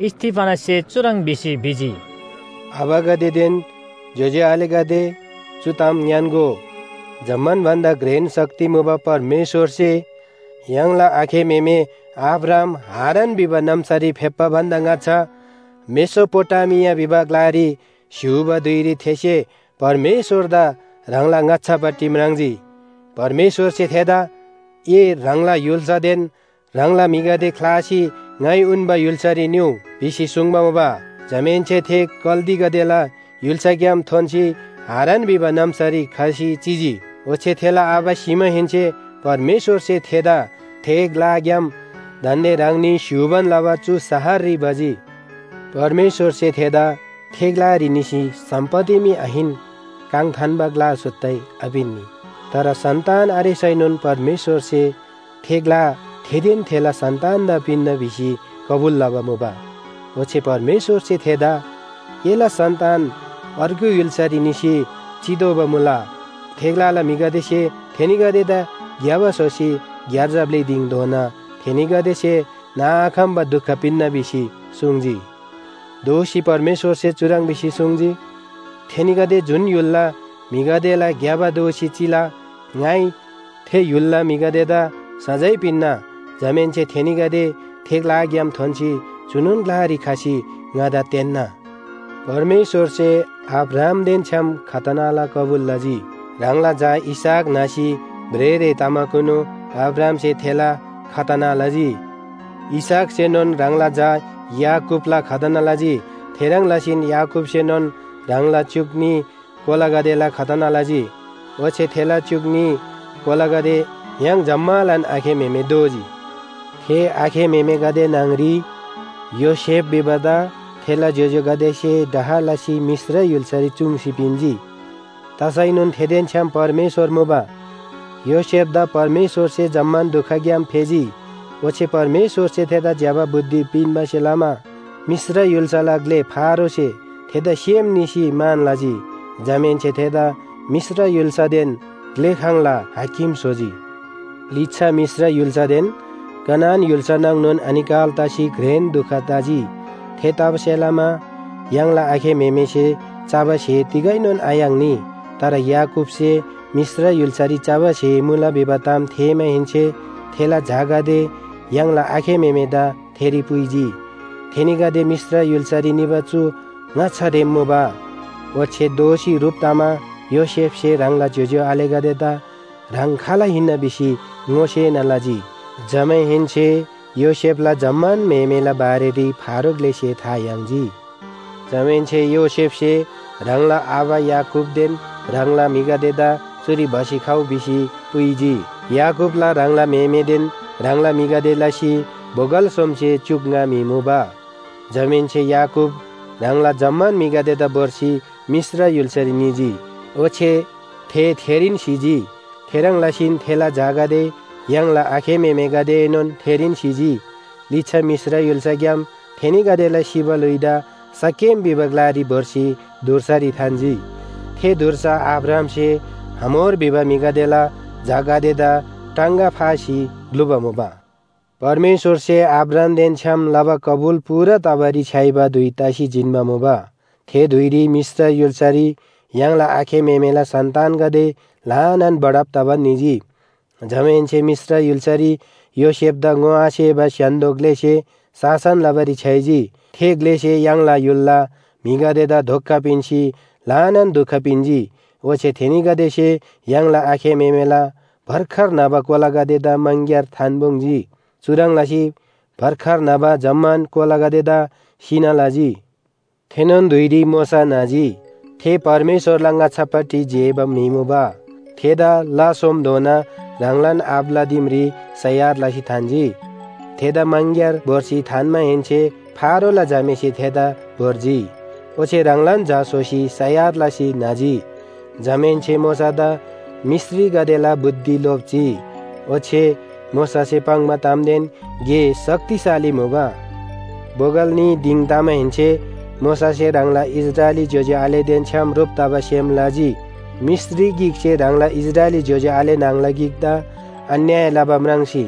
स्‍तिफनससे चुह्रङ् भिसी भिजी, “आबागदेदेन ज्‍योज्‍यो आलेगदे चु ताम ङ्‌यान्‍गो। जम्‍मान भन्‍दा घ्रेन शक्ति मुबा परमेश्‍वरसे य्‍हाङला आखे म्‍हेमे अब्राहाम हारान भिबा नाम्‍सारी फेप्‍बा भन्‍दा ङाच्‍छा मेसोपोटामिया भिबा ग्‍लारी स्‍य्‍हूबा धुइरी थेसे परमेश्‍वरदा ह्राङला ङाच्‍छापट्टि म्राङ्जी। परमेश्‍वरसे थेदा ‘ए ह्राङला य्‍हुल्‍सादेन ह्राङला म्‍हिगदे ख्‍लासी ङाइ उन्‍बा य्‍हुल्‍सारी निउ’ भिसी सुङ्बा मुबा। “जमाहेन्‍से थे कल्‍दीगदेला य्‍हुल्‍साग्‍याम थोन्‍सी हारान भिबा नाम्‍सारी खसी चिजी। ओच्‍छे थेला आबा सिमाहेन्‍से परमेश्‍वरसे थेदा थे ग्‍लाग्‍याम दान्‍दे ह्राङनी स्‍य्‍हूबान लबा चु शहररी भजी। परमेश्‍वरसे थेदा थे ग्‍लारी निसी सम्‍पत्ति मी आहिन काङ थान्‍बा ग्‍ला सुत्तै आपिन्‍नी। तर सन्‍तान आरेसैनोन परमेश्‍वरसे थे ग्‍ला थेदेन थेला सन्‍तानदा पिन्‍ना भिसी कबुल लबा मुबा। ओच्‍छे परमेश्‍वरसे थेदा “एला सन्‍तान अर्गु य्‍हुल्‍सारी निसी चितोःबा मुला, थे ग्‍लाला म्‍हिगदेसे थेनीगदेदा घ्‍यबा स्‍होसी ग्‍यार्जा ब्‍लि दिङधोना थेनीगदेसे नाआखम्‍बा दुख पिन्‍ना’ भिसी सुङ्जी। दोःसी परमेश्‍वरसे चुह्रङ् भिसी सुङ्जी, ‘थेनीगदे जुन य्‍हुलला म्‍हिगदेला घ्‍यबा दोःसी चिला ङाइ थे य्‍हुलला म्‍हिगदेदा सजाय पिन्‍ना। जमाहेन्‍से थेनीगदे थे ग्‍लाग्‍याम थोन्‍सी चुनोन ग्‍लारी खसी ङादा तेन्‍ना।’ “परमेश्‍वरसे अब्राहामदेन छ्‌याम खतनाला कबुल लजी। ह्राङला झा इसहाक न्‍हसी भ्रेःरे तमाकुनु अब्राहामसे थेला खतना लजी। इसहाकसेनोन ह्राङला झा याकूबला खतना लजी, थेह्रङ् लसीन याकूबसेनोन ह्राङला च्‍युक न्‍ही कोलागदेला खतना लजी। ओच्‍छे थेला च्‍युक न्‍ही कोलागदे य्‍हाङ जम्‍मालान आखे म्‍हेमे दोजी। “थे आखे म्‍हेमेगदे न्‍हङरी योसेफ भिबादा थेला ज्‍योज्‍योगदेसे डाह लसी मिश्र य्‍हुल्‍सारी चूङ्सी पिन्‍जी। तसैनोन थेदेन छ्‌याम परमेश्‍वर मुबा। योसेफदा परमेश्‍वरसे जम्‍मान दुखग्‍याम फेजी। ओच्‍छे परमेश्‍वरसे थेदा ज्‍यबा बुद्धि पिन्‍बासे लमा मिश्र य्‍हुल्‍साला ग्‍ले फारोसे थेदा सेम निसी मान लजी। जमाहेन्‍से थेदा मिश्र य्‍हुल्‍सादेन ग्‍लेखाङला हाकिम स्‍होजी। “लिच्‍छा मिश्र य्‍हुल्‍सादेन कनान य्‍हुल्‍सा नाङनोन अनिकाल तसी घ्रेन दुख तजी, थेतबासेलमा य्‍हाङला आखे म्‍हेमेसे चबा स्‍हे तिगैनोन आयाङ्नी। तर याकूबसे मिश्र य्‍हुल्‍सारी चबा स्‍हे मुला भिबा ताम थेःमाहेन्‍से थेला झागदे य्‍हाङला आखे म्‍हेमेदा थेरी पुइजी। थेनीगदे मिश्र य्‍हुल्‍सारी निबा चु ङाच्‍छारेम मुबा। ओच्‍छे दोःसी ह्रुप तमा योसेफसे ह्राङला ज्‍योज्‍यो आलेगदेदा ह्राङ खाल हिन्‍ना भिसी ङोसेना लजी। जमाहेन्‍से योसेफला जम्‍मान म्‍हेमेला बारेरी फारो ग्‍लेसे था याङ्जी। जमाहेन्‍से योसेफसे ह्राङला आबा याकूबदेन ह्राङला म्‍हिगदेदा चुरी भसी खउ भिसी पुइजी। याकूबला ह्राङला म्‍हेमेदेन ह्राङला म्‍हिगदे लसी बोगल सोमसे च्‍युक ङा म्‍हि मुबा। जमाहेन्‍से याकूब ह्राङला जम्‍मान म्‍हिगदेदा भोर्सी मिश्र य्‍हुल्‍सारी निजी, ओच्‍छे थे थेरीन सिजी। थेह्रङ् लसीन थेला झागदे य्‍हाङला आखे म्‍हेमेगदेएनोन थेरीन सिजी। लिच्‍छा मिश्र य्‍हुल्‍साग्‍याम थेनीगदेला सिबा ल्‍हुइदा शकेम भिबा ग्‍लारी भोर्सी धुर्सारी थान्‍जी। थे धुर्सा अब्राहामसे हमोर भिबा म्‍हिला झागदेदा टाङगा फासी ग्‍लुबा मुबा। “परमेश्‍वरसे अब्राहामदेन छ्‌याम लबा कबुल पूरा तबारी छ्‌याइबा धुइ तसी जिन्‍बा मुबा, थे धुइरी मिश्र य्‍हुल्‍सारी य्‍हाङला आखे म्‍हेमेला सन्‍तानगदे ल्‍हानान बढब तबान निजी। जमाहेन्‍से मिश्र य्‍हुल्‍सारी योसेफदा ङोआसेबा स्‍य्‍हान्‍दो ग्‍लेसे शासन लबारी छ्‌याइजी। थे ग्‍लेसे य्‍हाङला य्‍हुलला म्‍हिगदेदा धोका पिन्‍सी ल्‍हानान दुख पिन्‍जी। ओच्‍छे थेनीगदेसे य्‍हाङला आखे म्‍हेमेला भर्खर न्‍हबा कोलागदेदा मङग्‍यार थान्‍पुङ्‌जी। चुह्रङ् लसी भर्खर न्‍हबा जम्‍मान कोलागदेदा सिना लजी। “थेनोन धुइरी मोशा न्‍हजी। थे परमेश्‍वरला ङाच्‍छापट्टि जेबा म्‍हि मुबा। थेदा ला सोमधोना ह्राङलान आबाला दिमरी सयार लसी थान्‍जी। थेदा मङग्‍यार भोर्सी थान्‍माहेन्‍से फारोला झामेसे थेदा भोर्जी, ओच्‍छे ह्राङलान झा स्‍होसी सयार लसी न्‍हजी। जमाहेन्‍से मोशादा मिश्रीगदेला बुद्धि लोप्‍जी, ओच्‍छे मोशासे पाङ्बा तामदेन गे शक्तिशाली मुबा। “बोगल न्‍ही दिङ तमाहेन्‍से मोशासे ह्राङला इस्राएली ज्‍योज्‍यो आलेदेन छ्‌याम ह्रुप तबा सेम लजी। मिश्री गिकसे ह्राङला इस्राएली ज्‍योज्‍यो आले न्‍हङला गिकदा अन्‍याय लबा म्राङ्सी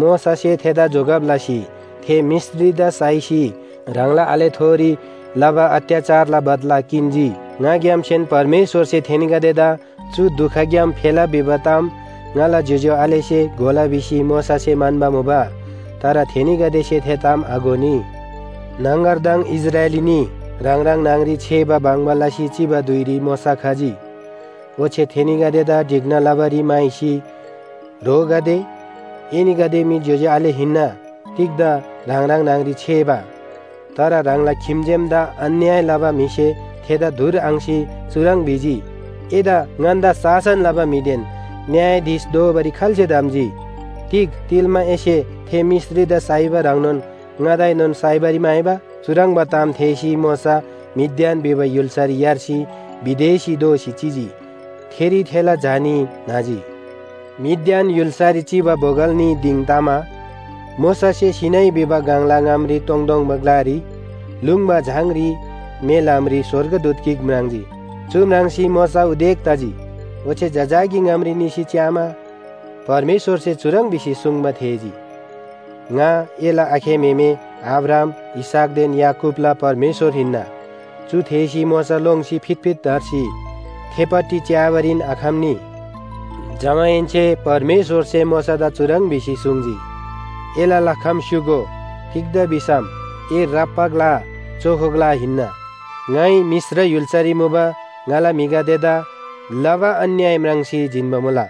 मोशासे थेदा जोगब लसी थे मिश्रीदा साइसी ह्राङला आलेथोरी लबा अत्‍याचारला बदला किन्‍जी। ङाग्‍यामसेन परमेश्‍वरसे थेनीगदेदा चु दुखग्‍याम फेला भिबा ताम ङाला ज्‍योज्‍यो आलेसे घोला भिसी मोशासे म्‍हन्‍बा मुबा। तर थेनीगदेसे थे ताम आघोनी। न्‍हङगरदङ इस्राएली न्‍ही ह्राङ ह्राङ न्‍हङरी छेबा बङ्बा लसी चिबा धुइरी मोशा खजी, ओच्‍छे थेनीगदेदा ढिक्‍ना लबारी म्‍हाइसी ‘ह्रोगदे, एनीगदे मी ज्‍योज्‍यो आले हिन्‍ना, तिग्‍दा ह्राङ ह्राङ न्‍हङ‍री छेबा?’ “तर ह्राङला खिम्‍जेमदा अन्‍याय लबा म्‍हिसे थेदा धुर आङ्‍सी चुह्रङ् भिजी, ‘एदा ङन्‍दा शासन लबा म्‍हिदेन न्‍यायाधीश दोबारी खाल्‍से धम्‍जी? तिग तिल्‍मा एसे थे मिश्रीदा साइबा ह्रङ्नोन ङादाएनोन साइबारी म्‍हाइबा?’ चुह्रङ्बा ताम थेःसी मोशा मिद्यान भिबा य्‍हुल्‍सारी यार्सी विदेशी दोसी चिजी। थेरी थेला झा न्‍ही न्‍हजी। “मिद्यान य्‍हुल्‍सारी चिबा बोगल न्‍ही दिङ तमा मोशासे सीनै भिबा गङला ङामरी तोङतोङबा ग्‍लारी लुङ्बा झाङरी मे ल्‍हामरी स्‍वर्गदूत गिक म्राङ्जी। चु म्राङ्सी मोशा उदेक तजी, ओच्‍छे जजाकी ङामरी निसी च्‍यामा परमेश्‍वरसे चुह्रङ् भिसी सुङ्बा थेःजी। ‘ङा एला आखे म्‍हेमे अब्राहाम, इसहाकदेन याकूबला परमेश्‍वर हिन्‍ना।’ चु थेःसी मोशा लोङ्सी फितफित धर्सी थेपट्टि च्‍याबारीन आखम्‍नी। “जमाहेन्‍से परमेश्‍वरसे मोशादा चुह्रङ् भिसी सुङ्जी, ‘एला लखम स्‍युगो। तिग्‍दा भिसम ए राप्‍बा ग्‍ला चोखो ग्‍ला हिन्‍ना। ङाइ मिश्र य्‍हुल्‍सारी मुबा ङाला म्‍हिगदेदा लबा अन्‍याय म्राङ्सी जिन्‍बा मुला,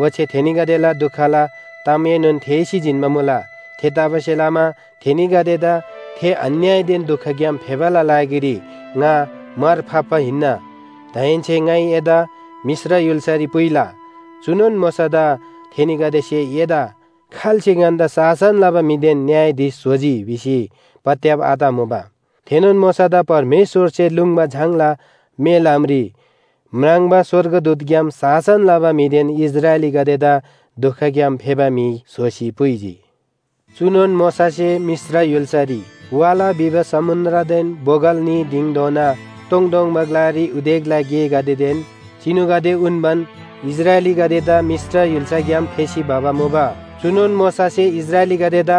ओच्‍छे थेनीगदेला दुखला तामएनोन थेःसी जिन्‍बा मुला। थेतबासेलमा थेनीगदेदा थे अन्‍यायदेन दुखग्‍याम फेबाला लागिरी ङा मार फाप्‍बा हिन्‍ना। दाहेन्‍से ङाइ एदा मिश्र य्‍हुल्‍सारी पुइला।’ “चुनोन मोशादा थेनीगदेसे ‘एदा खाल्‍से ङन्‍दा शासन लबा म्‍हिदेन न्‍यायाधीश स्‍होजी’ भिसी पत्‍याब आतमुबा, थेनोन मोशादा परमेश्‍वरसे लुङ्बा झाङला मे ल्‍हामरी म्राङ्बा स्‍वर्गदूतग्‍याम शासन लबा म्‍हिदेन इस्राएलीगदेदा दुखग्‍याम फेबा म्‍हि स्‍होसी पुइजी। चुनोन मोशासे मिश्र य्‍हुल्‍सारी, वाला भिबा समुन्‍द्रदेन बोगल न्‍ही दिङधोना तोङतोङबा ग्‍लारी उदेकला गेगदेदेन चिनुगदे उन्‍बान इस्राएलीगदेदा मिश्र य्‍हुल्‍साग्‍याम फेसी भबा मुबा। “चुनोन मोशासे इस्राएलीगदेदा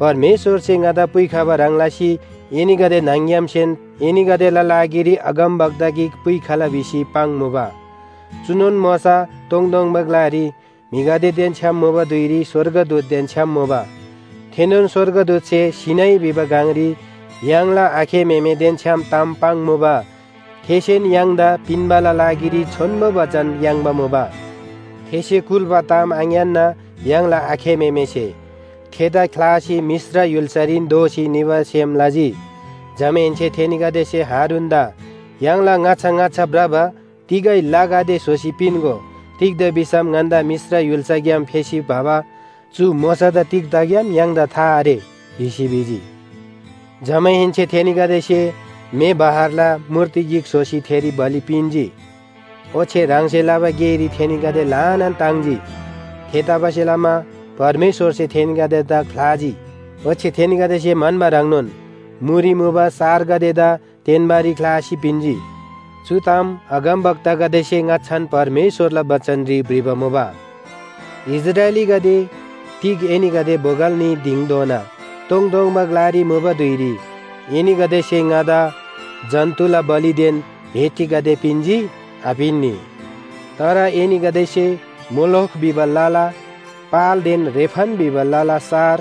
‘परमेश्‍वरसे ङादा पुइखबा ह्रङ् लसी एनीगदे न्‍हङ‌ग्‍यामसेन एनीगदेला लागिरी अगमवक्ता गिक पुइखला’ भिसी पाङ्मुबा। चुनोन मोशा तोङतोङबा ग्‍लारी म्‍हिगदेदेन छ्‌याम मुबा धुइरी स्‍वर्गदूतदेन छ्‌याम मुबा, थेनोन स्‍वर्गदूतसे सीनै भिबा गङरी य्‍हाङला आखे म्‍हेमेदेन छ्‌याम ताम पाङ्मुबा, थेसेन य्‍हाङदा पिन्‍बाला लागिरी छोन्‍बो बचन याङ्बा मुबा। “थेसे कुल्‍बा ताम आङ्‌यान्‍ना य्‍हाङला आखे म्‍हेमेसे थेदा ख्‍लासी मिश्र य्‍हुल्‍सारीन दोःसी निबा सेम लजी। जमाहेन्‍से थेनीगदेसे हारूनदा ‘य्‍हाङला ङाच्‍छा ङाच्‍छा भ्रबा तिगै लगदे स्‍होसी पिन्‍गो। तिग्‍दा भिसम ङन्‍दा मिश्र य्‍हुल्‍साग्‍याम फेसी भबा चु मोशादा तिग तगेम य्‍हाङदा था आरे’ भिसी भिजी। जमाहेन्‍से थेनीगदेसे म्‍हे बहरला मूर्ति गिक स्‍होसी थेरी बलि पिन्‍जी, ओच्‍छे ह्राङसे लबा गेरी थेनीगदे ल्‍हानान ताङ्जी। थेतबासेलमा परमेश्‍वरसे थेनीगदेदा ख्‍लाजी, ओच्‍छे थेनीगदेसे म्‍हन्‍बा ह्रङ्नोन मुरी मुबा सारगदेदा तेन्‍बारी ख्‍लासी पिन्‍जी। चु ताम अगमवक्तागदेसे ङाच्‍छान परमेश्‍वरला बचनरी भ्रिबा मुबा, ‘इस्राएलीगदे तिग एनीगदे बोगल न्‍ही दिङधोना तोङतोङबा ग्‍लारी मुबा धुइरी एनीगदेसे ङादा जन्‍तुला बलिदेन भेटीगदे पिन्‍जी? आपिन्‍नी। तर एनीगदेसे मोलोख भिबा लला पालदेन रेफन भिबा लला सार,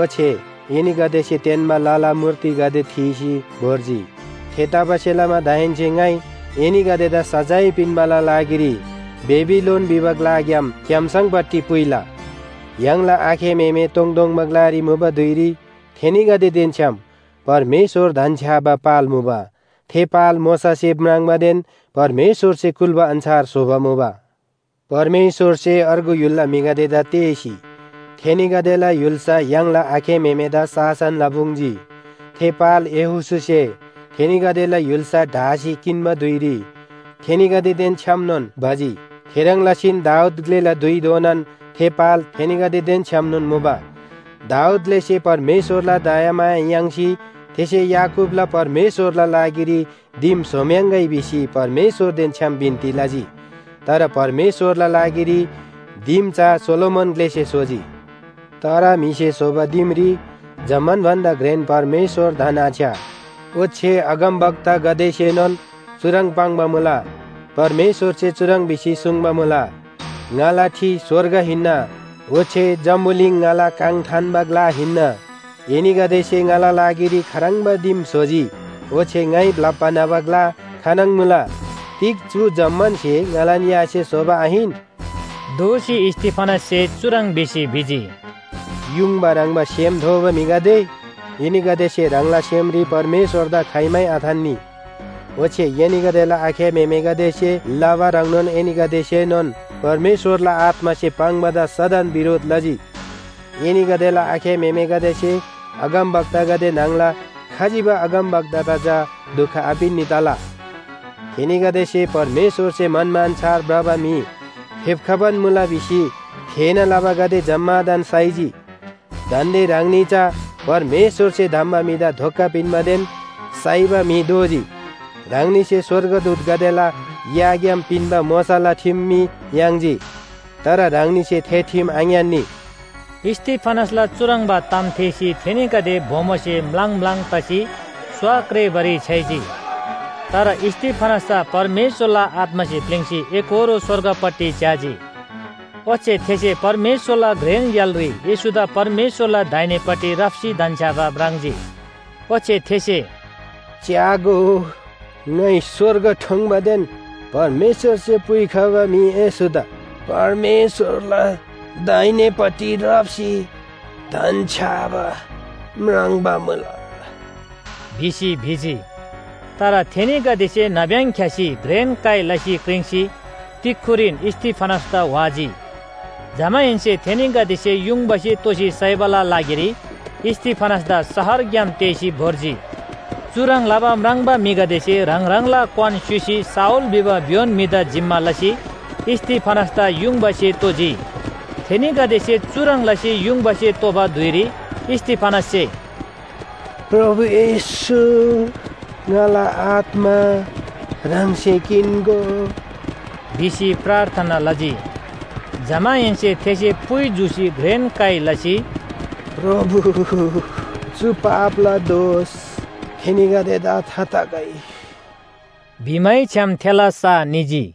ओच्‍छे एनीगदेसे तेन्‍बा लला मूर्तिगदे थीसी भोर्जी। थेतबासेलमा दाहेन्‍से ङाइ एनीगदेदा सजाय पिन्‍बाला लागिरी बेबिलोन भिबा ग्‍लाग्‍याम क्‍याम्‍सङपट्टि पुइला।’ “य्‍हाङला आखे म्‍हेमे तोङतोङबा ग्‍लारी मुबा धुइरी थेनीगदेदेन छ्‌याम परमेश्‍वर धन्‍छ्‌याबा पाल मुबा। थे पाल मोशासे म्राङ्बादेन परमेश्‍वरसे कुल्‍बा अन्‍छार स्‍होबा मुबा। परमेश्‍वरसे अर्गु य्‍हुलला म्‍हिगदेदा तेःसी थेनीगदेला य्‍हुल्‍सा य्‍हाङला आखे म्‍हेमेदा शासन लपुङ्‌जी। थे पाल यहोशूसे थेनीगदेला य्‍हुल्‍सा ढासी किन्‍बा धुइरी थेनीगदेदेन छ्‌यामनोन भजी। थेह्रङ् लसीन दाऊद ग्‍लेला धुइधोनान थे पाल थेनीगदेदेन छ्‌यामनोन मुबा। दाऊद ग्‍लेसे परमेश्‍वरला दयामाया याङ्सी थेसे याकूबला परमेश्‍वरला लागिरी दिम स्‍होम्‍याङ्‌गै भिसी परमेश्‍वरदेन छ्‌याम बिन्‍ती लजी। तर परमेश्‍वरला लागिरी दिम चा सोलोमन ग्‍लेसे स्‍होजी। “तर म्‍हिसे स्‍होबा दिमरी जम्‍मान भन्‍दा घ्रेन परमेश्‍वर धन्‍आछ्‌या, ओच्‍छे अगमवक्तागदेसेनोन चुह्रङ् पाङ्बा मुला। परमेश्‍वरसे चुह्रङ् भिसी सुङ्बा मुला, ‘ङाला ठि स्‍वर्ग हिन्‍ना, ओच्‍छे जम्‍बुलिङ ङाला काङ थान्‍बा ग्‍ला हिन्‍ना। एनीगदेसे ङाला लागिरी खाह्रङ्बा दिम स्‍होजी? ओच्‍छे ङाइ ब्‍लप्‍बा न्‍हबा ग्‍ला खानङ मुला? तिग चु जम्‍मान स्‍हे ङालान यासे स्‍होबा आहिन?’” दोःसी स्‍तिफनससे चुह्रङ् भिसी भिजी, “युङबा ह्रङ्‌बा सेम थोबा म्‍हिगदे, एनीगदेसे ह्राङला सेमरी परमेश्‍वरदा खाइमै आथान्‍नी। ओच्‍छे एनीगदेला आखे म्‍हेमेगदेसे लबा ह्रङ्नोन एनीगदेसेनोन परमेश्‍वरला आत्‍मासे पाङ्‌बादा सदन बिरोध लजी। एनीगदेला आखे म्‍हेमेगदेसे अगमवक्तागदे न्‍हङला खजिबा अगमवक्तादा चा दुख आपिन्‍नी तला? थेनीगदेसे परमेश्‍वरसे म्‍हन्‍बा अन्‍छार भ्रबा म्‍हि फेप्‍खबान मुला भिसी थेःना लबागदे जम्‍मादान साइजी। दान्‍दे ह्राङनी चा परमेश्‍वरसे धम्‍बा म्‍हिदा धोका पिन्‍बादेन साइबा म्‍हि दोजी। ह्राङनीसे स्‍वर्गदूतगदेला याग्‍याम पिन्‍बा मोशाला ठिम मी याङ्जी। तर ह्राङनीसे थे ठिम आङ्‌यान्‍नी।” स्‍तिफनसला चुह्रङ्बा ताम थेःसी थेनीगदे बोमोसे म्‍लाङ म्‍लाङ तसी स्‍वा क्रेबारी छ्‌याइजी। तर स्‍तिफनस चा परमेश्‍वरला आत्‍मासे प्‍लिङ्‌सी एकोहोरो स्‍वर्गपट्टि च्‍याजी। ओच्‍छे थेसे परमेश्‍वरला घ्रेन य्‍हालरी येशूदा परमेश्‍वरला दाहिनेपट्टि राप्‍सी धन्‍छ्‌याबा म्राङ्जी। ओच्‍छे थेसे “च्‍यागो, ङाइ स्‍वर्ग ठोङ्‌बादेन परमेश्‍वरसे पुइखबा म्‍हि येशूदा परमेश्‍वरला दाहिनेपट्टि राप्‍सी धन्‍छ्‌याबा म्राङ्बा मुला” भिसी भिजी। तर थेनीगदेसे नाब्‍यङ ख्‍यासी घ्रेन काइ लसी क्रिङ्सी तिक्‍खुरीन स्‍तिफनसदा व्‍हाजी। जमाहेन्‍से थेनीगदेसे युङबासे तोसी साइबाला लागिरी स्‍तिफनसदा शहरग्‍याम तेःसी भोर्जी। चुह्रङ् लबा म्राङ्बा म्‍हिगदेसे ह्राङ ह्राङला क्‍वान स्‍युसी शाऊल भिबा भ्‍योन म्‍हिदा जिम्‍मा लसी स्‍तिफनसदा युङबासे तोजी। थेनीगदेसे चुह्रङ् लसी युङबासे तोबा धुइरी स्‍तिफनससे “प्रभु येशू ङाला आत्‍मा ह्राङसे किन्‍गो” भिसी प्रार्थना लजी। जमाहेन्‍से थेसे पुइ जूसी घ्रेन काइ लसी, “प्रभु, चु पापला दोष थेनीगदेदा थाखगै” भिमैछ्‌याम थेला सा निजी।